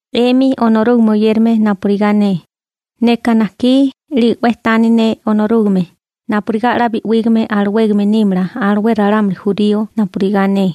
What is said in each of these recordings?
'Emi Onorúgame oyérame napurigá ne, neka najkí 'lige 'we tani ne Onorúgame napurigá 'la bi'wígame alawégame nímala alué ralámuli jurío napurigá ne.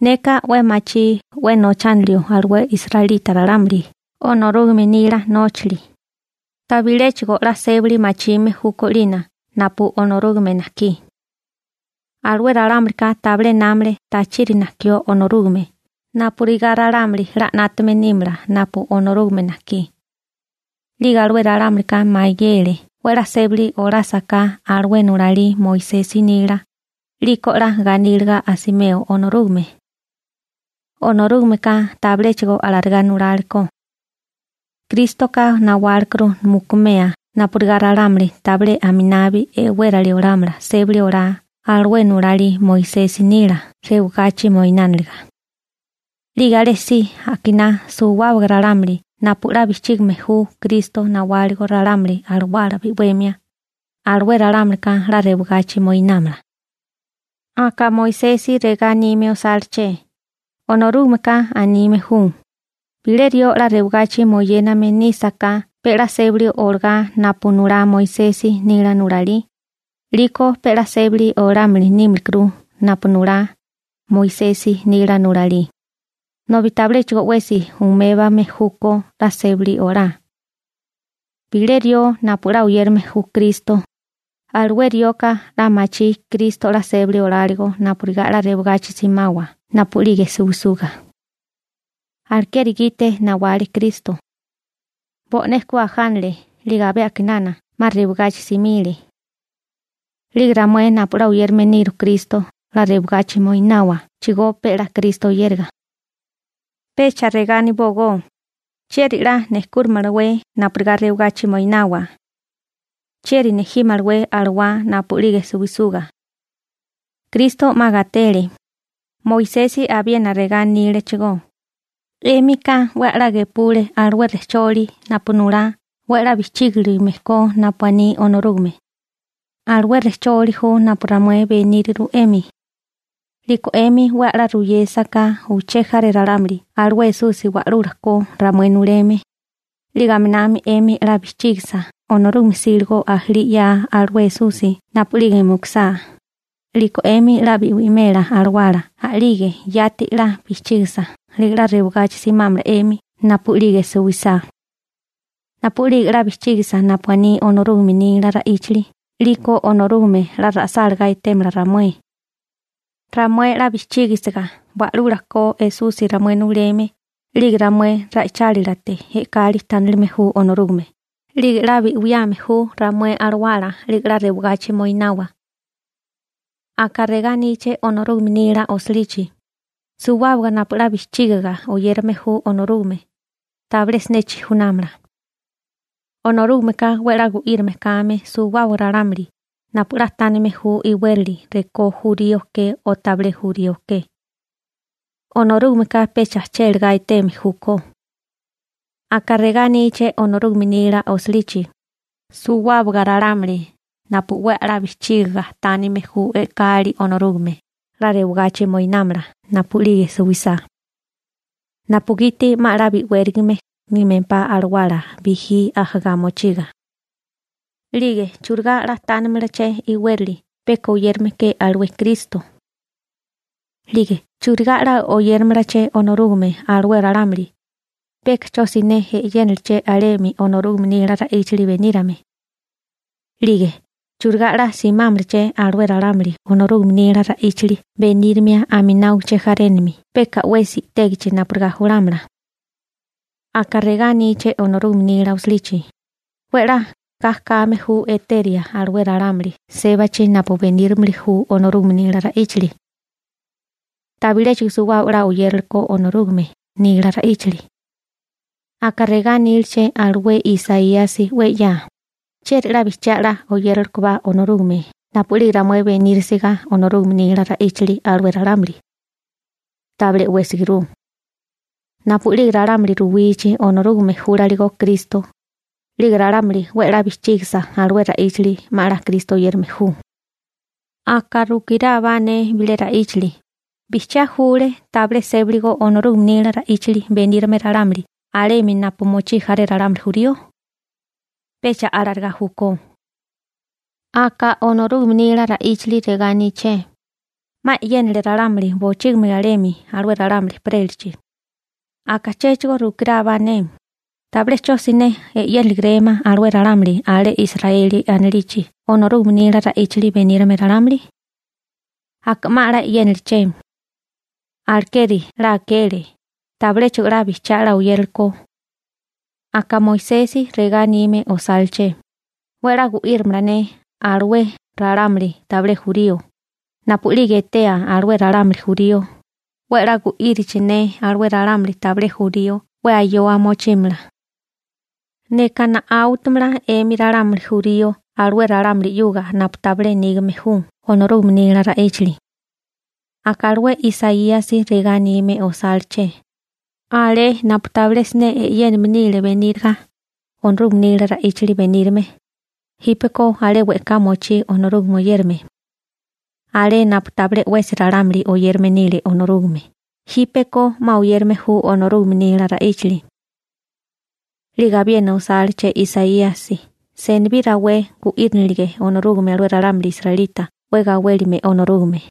Neka 'we machí 'we nochánilio alué israelita ralámuli Onorúgame nila nóchali, tabiléchigo 'la sébali machime júkó 'lina napu Onorúgame najkí. Alué ralámulika tabilé námale tachiri najkió Onorúgame napurigá ralámuli 'la 'nátame nímala napu Onorúgame najkí. 'Lige alué ralámulika mayele 'we 'la sébali olásaká alué nulalí Moisesi nila, 'liko 'la ganíliga asimeo Onorúgame. Onorúgameka tabiléchigo alarigá nulálekó. Krístoka nawálekuru mukumea napurigá ralámuli tabilé aminabi e'wérali olámala sébali olá alué nulalí Moisesi nila rewagachi moinániliga. 'Lige alésí akiná suwábaga ralámuli napu 'la bijchígime ju Kristo nawáligo ralámuli alawala bi'wemia, alué ralámulika 'la rewagachi moinámala. Aka Moisesi regá anime osáleché: «Onorúgameka anime ju: Bilé rió 'la rewagachi moyéname nísaká pe 'la sébali olagá napu nulá Moisesi nila nulalí, 'liko pe 'la sébali olámili nímikuru napu nulá Moisesi nila nulalí, nobi tabiléchigo 'wesi umébame júkó 'la sébali olá.» Bilé rió napu 'la oyérame ju Kristo, alué rioka 'la machí Kristo 'la sébali oláligo napurigá 'la rewagachi simawa napu'lige suwisuga. Alekeri gite nawale Kristo. Bo'né ku ajánale 'lige abé a'kinana 'ma rewagachi simile. 'Lige ramué napu 'la oyérame niru Kristo 'la rewagachi moináwachigó pe 'la Kristo oyériga. Pecha regá anibógó: «¿Chieri 'la nejkúrimalawé napurigá rewagachi moinawa? ¿Chieri nejímalawé alawá napu'lige suwisuga?» Kristo 'ma gatele. Moisesi abiena regá anílechigó: «'Émika 'we a'lá gepule alué rejcholi napu nulá 'we 'la bijchígilime ko napu aní Onorúgame.» Alué rejcholi ju napu ramué beníriru 'emi. 'Liko 'emi 'we 'la ruyésaká uché jaré ralámuli alué Esusi Wa'lula ko ramué nuleme, 'lige aminami 'emi 'la bijchígisa Onorúgame 'síligo ajalí 'ya alué Esusi napu'lige mukusá, 'liko 'emi 'la bi'wimela alawala a'lige yati 'la bijchígisa 'lige 'la rewagachi simámala 'emi napu'lige suwisá. Napu'lige 'la bijchígisiga napu aní Onorúgame nila ra'íchali 'liko Onorúgame 'la ra'sálagá etémala ramué. Ramué 'la bijchígisiga Wa'lula ko Esusi ramué nuleme, 'lige ramué ra'ichálilate e'kali tánilime ju Onorúgame, 'lige 'la bi'wiame ju ramué alawala 'lige 'la rewagachi moinawa. Aka regá aníché Onorúgame nila osilichi: «Suwábaga napu 'la bijchígiga oyérame ju Onorúgame, tabilé siné chijunámala.» Onorúgameka 'we 'la gu'írame kame suwábaga ralámuli napu 'la tánime ju iwérali rekó jurío ke o tabilé jurío ke. Onorúgameka pecha chélegá eteme júkó. Aka regá aníché Onorúgame nila osilichi: «Suwábaga ralámuli napu 'we a'lá bijchígiga tánime ju e'kali Onorúgame 'la rewagachi moinámala napu'lige suwisá, napugiti 'ma 'la bi'wérigame nímempá alawala bijí ajá mochiga.» 'Lige ¿churigá 'la tánimalaché iwérali peka oyérame ke alué Kristo? 'Lige ¿churigá 'la oyéramalaché Onorúgame alué ralámuli, peka 'cho siné e'yénaché alemi Onorúgame nila ra'íchali benírame? 'Lige ¿churigá 'la simámalaché alué ralámuli Onorúgame nila ra'íchali benírimia aminá uché jarénami peka 'wesi i'tégichi napurigá julámala? Aka regá aníché Onorúgame nila osilichi: «'We 'la ga kame ju eteria alué ralámuli sébachi napu benírimili ju Onorúgame nila ra'íchali.» Tabiléchigo suwábaga 'la oyéralekó Onorúgame nila ra'íchali. Aka regá aníleché alué Isaíasi 'we 'ya: «¿Chieri 'la bijchiá 'la oyéralekobá Onorúgame napu'lige ramué benírisiga Onorúgame nila ra'íchali alué ralámuli? Tabilé 'wésiguru.» Napu'lige ralámuli ruwichi Onorúgame júlaligo Kristo, 'lige ralámuli 'we 'la bijchígisa alué ra'íchali 'ma 'la Kristo oyérame ju. Aka rukirábá ne bilé ra'íchali: ¿Bijchiá júlé tabilé sébaligo Onorúgame nila ra'íchali benírame ralámuli alemi napu mochí jaré ralámuli jurío? Pecha alarigá júkó. Aka Onorúgame nila ra'íchali regá aníché: 'Ma e'yénale ralámuli bochígimi alemi alué ralámuli ejperélachi. Aka chéchigo rukirábá ne: ¿Tabilé 'cho siné e'yéniligarémá alué ralámuli alé Israeli anilichi Onorúgame nila ra'íchali benírame ralámuli? Aka 'ma 'la e'yéniliché. Alekeri 'la akele, tabiléchigo 'la bijchiá 'la oyéralekó. Aka Moisesi regá anime osáleché: 'We 'la gu'írimala ne (Onorúgame) alué ralámuli tabilé jurío, napu'lige etea alué ralámuli jurío 'we 'la gu'írichi ne alué ralámuli tabilé jurío 'we ayoa mochímala. Neka na'áutamala 'emi ralámuli jurío alué ralámuli 'yuga napu tabilé nígame ju Onorúgame nila ra'íchali. Aka alué Isaíasi regá anime osáleché: Alé napu tabilé siné e'yéname nile beníriga Onorúgame nila ra'íchali benírame, jípeko alé we'ká mochí Onorúgame oyérame. Alé napu tabilé 'wesi ralámuli oyérame nile Onorúgame jípeko 'ma oyérame ju Onorúgame nila ra'íchali. 'Lige abiena osáleché Isaíasi: «Senibí rawé gu'írinilige Onorúgame alué ralámuli israelita 'we gawélime Onorúgame.»